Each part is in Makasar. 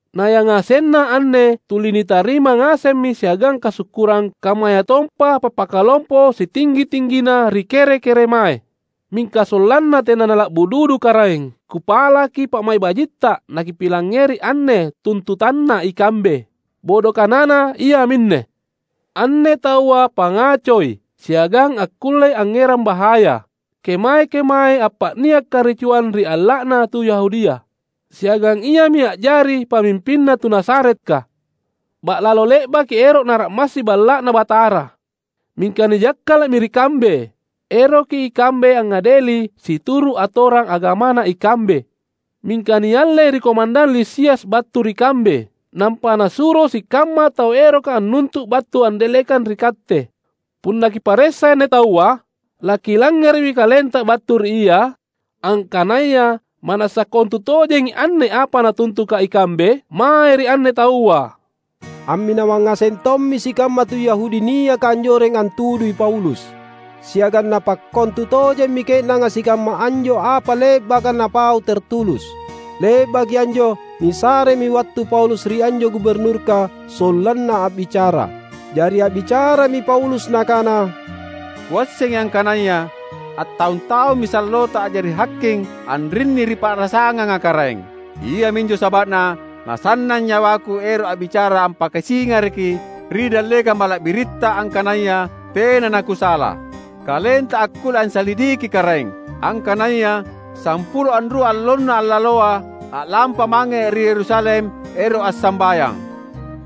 Nayangasenna anne tuli nitarima ngasemmi siagang kasukkurang kammayatompa pappakalompo sitinggi-tinggina ri kere-keremae. Mingka sollanna tena nala’bu dudu karaeng, kupalaki pa’mai’ bajitta nakipilangngeri anne tuntutanna ikambe. Bodo kanana iaminne: Anne taua pangacoi siagang akkullei angngerang bahaya. Kemae-kemae appa’nia’ karicuang ri alla’na tu Yahudia. Siagang iami a’jari pamimpinna tu Nazaretka. Ba’lalo le’baki ero’ nara’massi Balla’Na Batara, mingka nijakkala’mi ri kambe. [Eroki ikambe angngadeli situru' atorang agamana ikambe. Mingka niallei ri komandang Lisias battu ri kambe, nampa nasuro sikamma tau eroka annuntu' battu andallekang ri katte.] Punna kiparessa anne taua, lakilangngere’mi kalenta battu ri ia, angkanaya ma’nassa kontutojengi anne apa natuntuka ikambe mae ri anne taua." Amminawang ngaseng tommi sikamma tu Yahudi niaka anjoreng antudui Paulus. Siagang napakkontu tojemmi ke’nanga sikamma anjo apa le’baka napau Tertulus. Le’baki anjo nisaremi wattu Paulus ri anjo Guburnurka sollanna a’bicara. Jari a’bicarami Paulus nakana, "Kuassengi angkanaya attaung-taummi sallota a’jari haking anrinni ri pa’rasanganga karaeng. Iaminjo saba’na nasannang nyawaku ero’ a’bicara ampakasingaraki ri dallekang mala’biritta angkanaya tena nakusala. Kalenta akkulle ansalidiki karaeng, angkanaya sampulo anrua allonna allaloa, a’lampa’ mange ri Yerusalem, ero’ assambayang.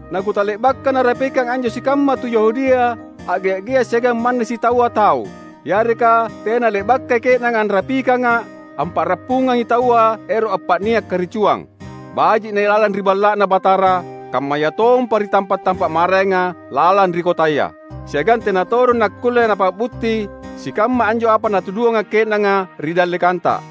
Nakutale’baka narapikang anjo sikamma tu Yahudia a’gea’-gea’ siagang manna sitaua tau; yareka tena le’bakai ke’nanga anrapikanga’ ampa’rappungangi taua ero’ appa’nia’ karicuang, baji’ nailalang ri Balla’Na Batara kammayatompa ri tampa’-tampa’ maraenga lalang ri kotaya. Siagang tena todong nakkulle napa’butti sikamma anjo apa natuduanga’ ke’nanga ri dallekanta.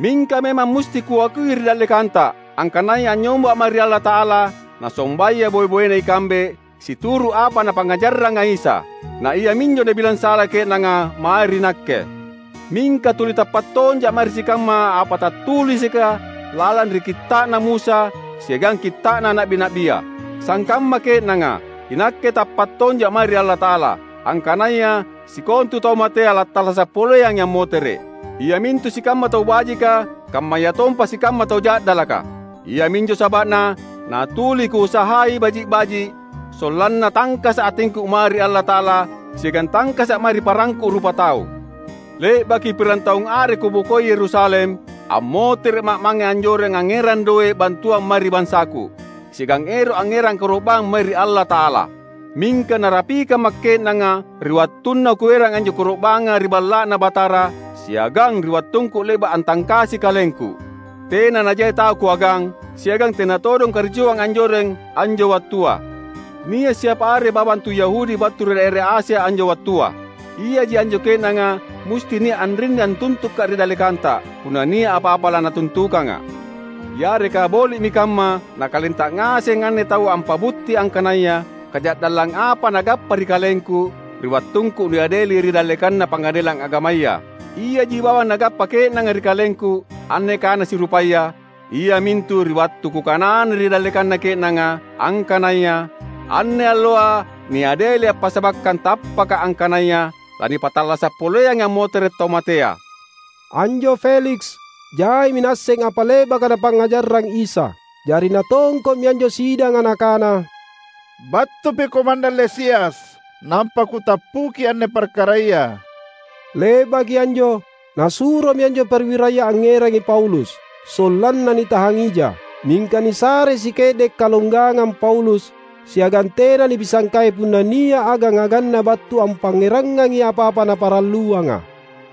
Mingka memang musti kuakui ri dallekanta, angkanaya anynyomba’ mae ri Allata’ala nasombaya boe-boena ikambe situru’ apa Napangngajarranga Isa; na iaminjo nabilang sala ke’nanga mae ri nakke. Mingka tuli tappa’ tonja’ mae ri sikamma apa tattulisika lalang ri Kitta’na Musa siagang Kitta’na Na’bi-na’bia. Sangkamma ke’nanga, inakke tappa’ tonja’ mae ri Allata’ala, angkanaya sikontu tau matea lattallasa’ poleangi ammotere’ — iamintu sikamma tau bajika kammayatompa sikamma tau ja’dalaka! Iaminjo saba’na natuli kuusahai baji’-baji’, sollanna tangkasa’ atingku mae ri Allata’ala siagang tangkasa’ mae ri parangku rupatau. Le’baki pirang taung are kubokoi Yerusalem, ammotere’ma’ mange anjoreng angngerang doe’ bantuang mae ri bansaku, siagang ero’ angngerang koro’bang mae ri Allata’ala. Mingka narapikamma’ ke’nanga ri wattunna kuerang anjo koro’banga ri Balla’Na Batara, siagang ri wattungku le’ba’ antangkasi kalengku. Tena najai tau kuagang, siagang tena todong karicuang anjoreng anjo wattua. Nia’ siapa are bawang tu Yahudi battu ri daera Asia, anjo wattua. Iaji anjo ke’nanga musti nia’ anrinni antuntuka’ ri dallekanta, punna nia’ apa-apa lanatuntukanga’. Yareka boli’mi kamma nakalenta ngaseng anne taua ampa’butti angkanaya kaja’dallang apa nagappa ri kalengku, ri wattungku niadeli ri dallekanna Pangadelang Agamaya. Iaji bawang nagappa ke’nanga ri kalengku, anne kana sirupaya, iamintu ri wattu kukanana ri dallekanna ke’nanga, angkanaya: anne alloa niadelia’ passabakkang tappaka’ angkanaya lanipattallasa’ poleangi ammotere’ tau matea." Anjo Feliks, jaimi naasseng apa le’baka Napangngajarrang Isa. Jari natongko’mi anjo sidanga nakana, "Battupi komandang Lisias nampa kutappuki anne parkaraya." Le’baki anjo nasuromi anjo perwiraya angngerangi Paulus, sollanna nitahang ija. Mingka nisarei sike’de’ kalonggangang Paulus, siagang tena nipisangkai punna nia’ agang-aganna battu ampangngerangangi apa-apa naparalluanga.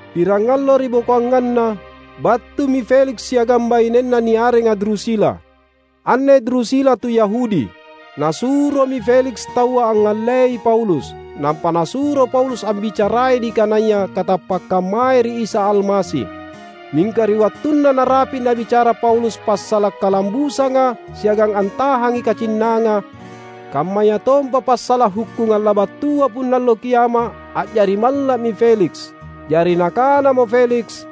Pirangallo are ribokoanganna, battumi Feliks siagang bainenna niarenga Drusila; anne Drusila tu Yahudi. Nasuromi Feliks taua angngallei Paulus, nampa nasuro Paulus ambicarai nikanaya katappakkang mae ri Isa Almasi. Mingka ri wattunna narapi’ nabicara Paulus passala’ kalambusanga siagang antahangi kacinnanga, kammayatompa passala’ hukkungang labattua punna Allo Kiama’, a’jari malla’mi Feliks. Jari nakanamo Feliks,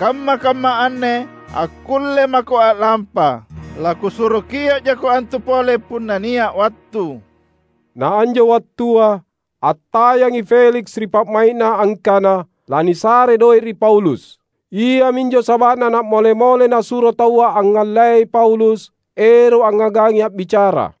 "Kamma-kamma anne akkulle mako a’lampa. Lakusuro kio’ jako antu pole punna nia’ wattu." Naanjo wattua attayangi Feliks ri pa’mai’na angkana lanisarei doe’ ri Paulus. Iaminjo saba’na na’mole-mole nasuro taua angngallei Paulus ero’ angngagangi a’bicara.